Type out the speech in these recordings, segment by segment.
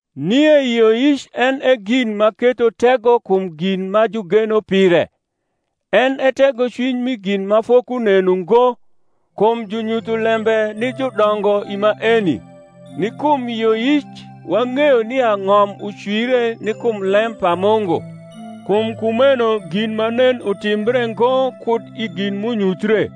Nie yioyic en e gin ma ketho tego kum gm ma jugeno pire, en e tegocwiny mi gin ma fokunen ungo. Kum junyutho lembe ni judongo i maeni. Ni kum yioyic wang’eyo nia ng’om ucwire ni kum lem pa Mungu, kum kumeno gin ma nen utimbre ngo kud i gin m’unyuthie.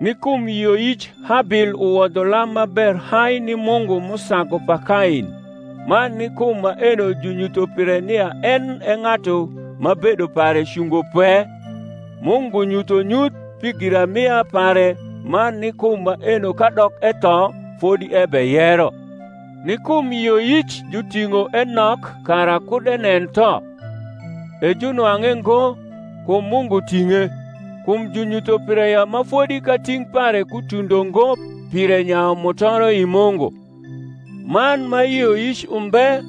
Ni kum yioyic Habil uwodho lam ma ber hai ni Mungu m’usagu pa Kain, man ni kum maeno junyutho pire nia en e ng’atu ma bedo pare cungo pwe, Mungu nyutho nyuth pi giramia pare man ni kum maeno kadok etho fodi ebeyero. Ni kum yioyic juting’o Enok kara kud enen tho; e junwang’e ngo, kum Mungu ting’e; kum junyutho pire ya ma fodi kating’ pare kutundo ngo pire nyayu mutoro i Mungu: man ma yioyic umbe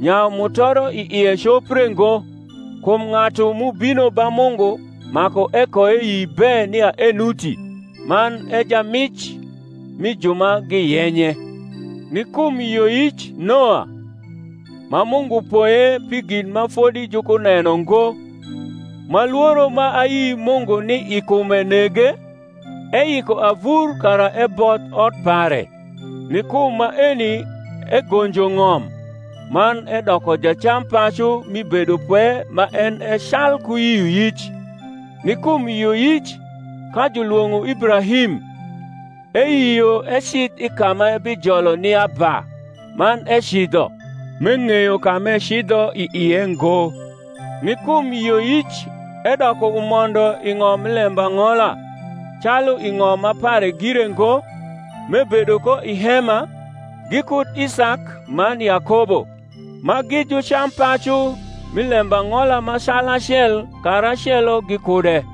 nyayu mutoro i ie copre ngo; kum ng’atu m’ubino ba Mungu maku ekoeyi be nia enuti, man e jamic mi ju ma giyenye. Ni kum yioyic Noa, ma Mungu poye pi gin ma fodi jukuneno ngo, ma lworo ma ayi Mungu ni i kume nege, eyiko avur kara ebodh ot pare; ni kum maeni egonjo ng’om, man edoko jacampacu mi bedopwe ma en e calku yioyic. Ni kum yioyic, ka julwong’o Ibrahim, eyio ecidh i ka m’ebijolo ni aba; man ecidho, m’eng’eyo ka m’ecidho i ie ngo. Ni kum yioyic edoko umondo i ng’om mi lembang’ola, calu i ng’om ma pare gire ngo, m’ebedo ko i hema, gikud Isak man Yakobo, ma gi jucampacu, mi lembang’ola ma calacel karacelo gikude: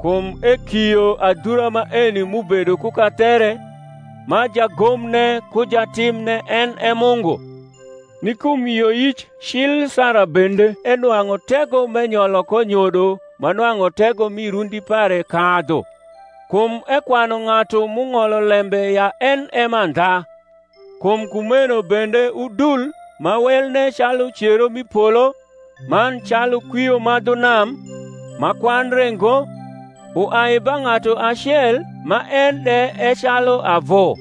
kum ekio adhura maeni m’ubedo ku kathere, ma jagomne ku jatimne en e Mungu. Ni kum yioyic cil Sara bende enwang’u tego m’enyolo ko nyodo ma nwang’u tego mi rundi pare kadhu, kum ekwanu ng’atu m’ung’olo lembe ya en e mandha: kum kumeno bende udni ma welne calu cero m’i polo, man calu kwio ma dhu nam, ma kwandre ngo, uai ba ng’atu acel man en de e calu avu.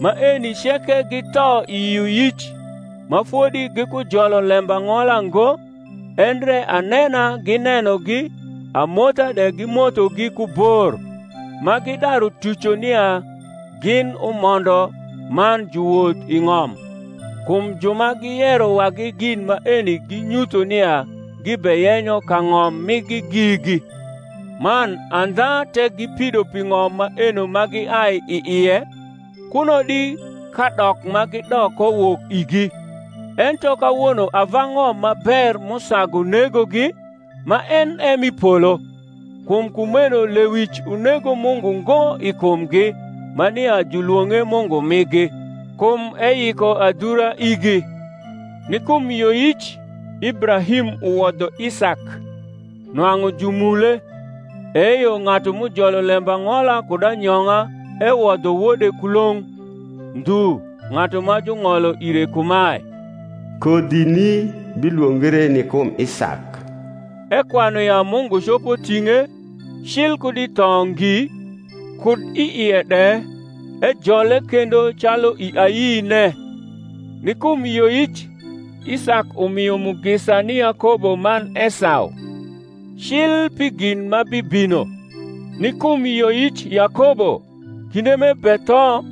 Maeni ceke githo i yioyic, ma fodi gikujolo lembang’ola ngo, endre anena ginenogi amotha de gimothogi ku bor, ma gidaru tuco nia gin umondo man juwoth i ng’om. Kum ju ma giyero wagi gin maeni ginyutho nia gibeyenyo kang’om migi gigi. Man andha tek gipido pi ng’om maeno ma giai i ie, kuno di kadok ma gidok ko wok igi. Ento kawono ava ng’om ma ber m’usagu negogi, ma en e m’i polo: kum kumeno lewic unego Mungu ngo i kumgi, ma nia julwong’e Mungu migi; kum eyiko adhura Ni kum yioyic, Ibrahim uwodho Isak, nwang’u jumule; eyo ng’atu m’ujolo lembang’ola kud anyong’a ewodho wode kulong’; ndhu ng’atu ma jung’olo ire kumae, Kodhini bilwongre ni kum Isak: ekwanu ya Mungu copo ting’e, cil kud i tho ngi; kud i ie de ejole kendo calu i ayine. Ni kum yioyic Isak umio mugisa ni Yakobo man Esau, cil pi gin ma bibino. Ni kum yioyic Yakobo, kinde m’ebetho,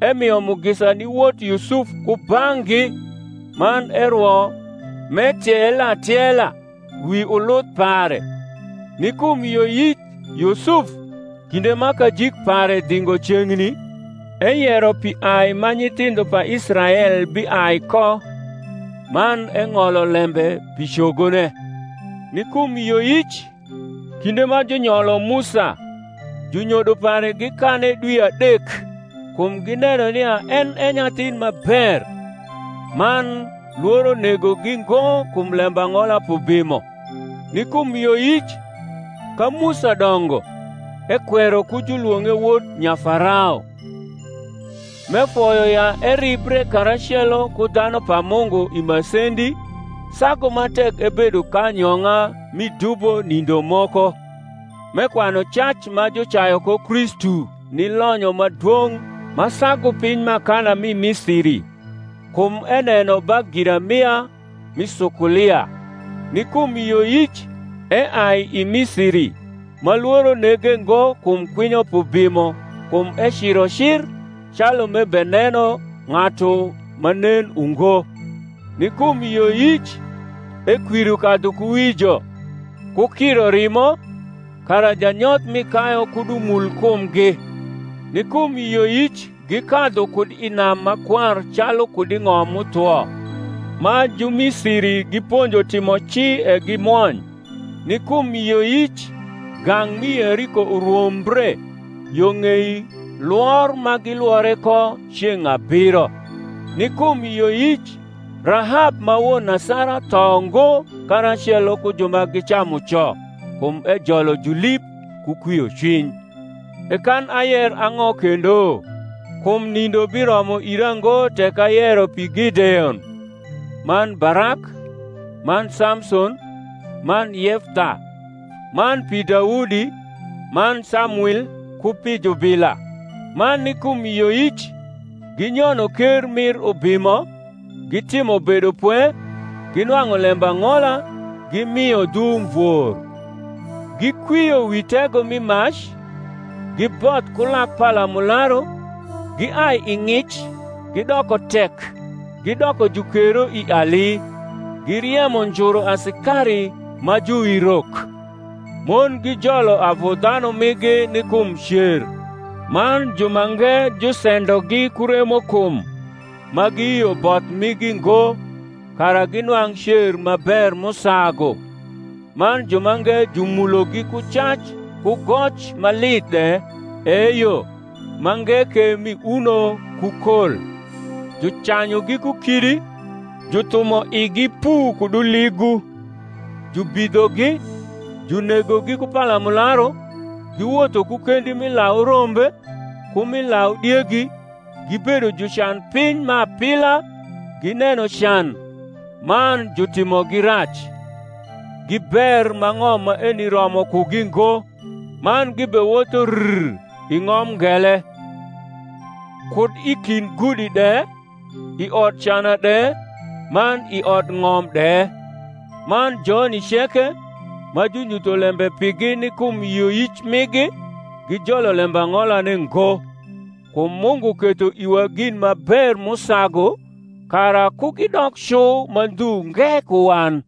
emio mugisa ni wot Yusuf kubang’gi; man erwo, m’etiele atiela wi uluth pare. Ni kum yioyic Yusuf. kinde ma kajik pare dhingo ceng’ni, eyero pi ai ma nyithindho pa Israel biai ko; man eng’olo lembe pi cogone. Ni kum yioyic, kinde ma junyolo Musa, junyodo pare gikane dwi adek, kum gineno nia en e nyathin ma ber; man lworo negogi ngo kum lembang’ola p’ubimo. Ni kum yioyic, ka Musa dongo, ekwero ku julwong’e wod Nyafarao; m’efoyo ya eribre karacelo ku dhanu pa Mungu i masendi, sagu ma tek ebedo k’anyong’a mi dubo nindo moko; m’ekwanu cac ma jucayu ko Kristu ni lonyo ma dwong’ ma sagu piny m’akana mi Misiri: kum eneno ba giramia rni sukulia. Ni kum yioyic eai i Misiri, ma lworo nege ngo kum kwinyo p’ubimo: kum eciro cir, calu m’ebeneno ng’atu ma nen ungo. Ni kum yioyic ekwiro kadhukuwijo, ku kiro rimo, kara janyoth mi kayu kud umul kumgi. Ni kum yioyic gikadhu kud i nam Makwar calu kud i ng’om m’uthwo: ma Jumisiri giponjo timo ci e gimwony. Ni kum yioyic gang’ mi Yeriko urwombre, yo ng’ei Iwor ma gilwore ko ceng’ abiro. Ni kum yioyic Rahab ma won asara tho ngo karacelo ku ju ma gicamu co, kum ejolo julib ku kwiocwiny. E kan ayer ang’o kendo? kum nindo biromo ira ngo tek ayero pi Gideon, man Barak, man Samson, man Yeftha; man pi Daudi man Samwil ku pi jubila: ma ni kum yioyic ginyono ker mir ubimo, gitimo bedopwe, ginwang’u lembang’ola, gimio dhu umvor, gikwio wi tego mi mac, giboth ku lak palamularu, giai i ng’ic gidoko tek, gidoko jukero i ali, giriemo njuru asikari ma juwirok. Mon gijolo avu dhanu migi ni kum cer: man jumange jusendogi ku remokum, ma giyio both migi ngo; kara ginwang’ cer ma ber m’usagu: man jumange jumulogi ku cac ku goc ma lith de, eyo, mange ke mi uno ku kol; jucanyugi ku kidi, juthumo igi pu kud uligu, jubidhogi, junegogi ku palamularu: giwotho ku kendi mi lau rombe, ku mi lau diegi, gibedo jucan piny ma apila, gineno can, man jutimogi rac (gi ber ma ng’om maeni romo kugi ngo), man gibewotho rr i ng’om ngele, kud i kind gudi de, i odcana de, man i odng’om de. Man joni ceke, ma junyutho lembe pigi ni kum yioyic migi, gijolo lembang’olane ngo, kum Mungu ketho iwa gin ma ber m’usagu, kara ku gidok cu ma ndhu nge ku wan.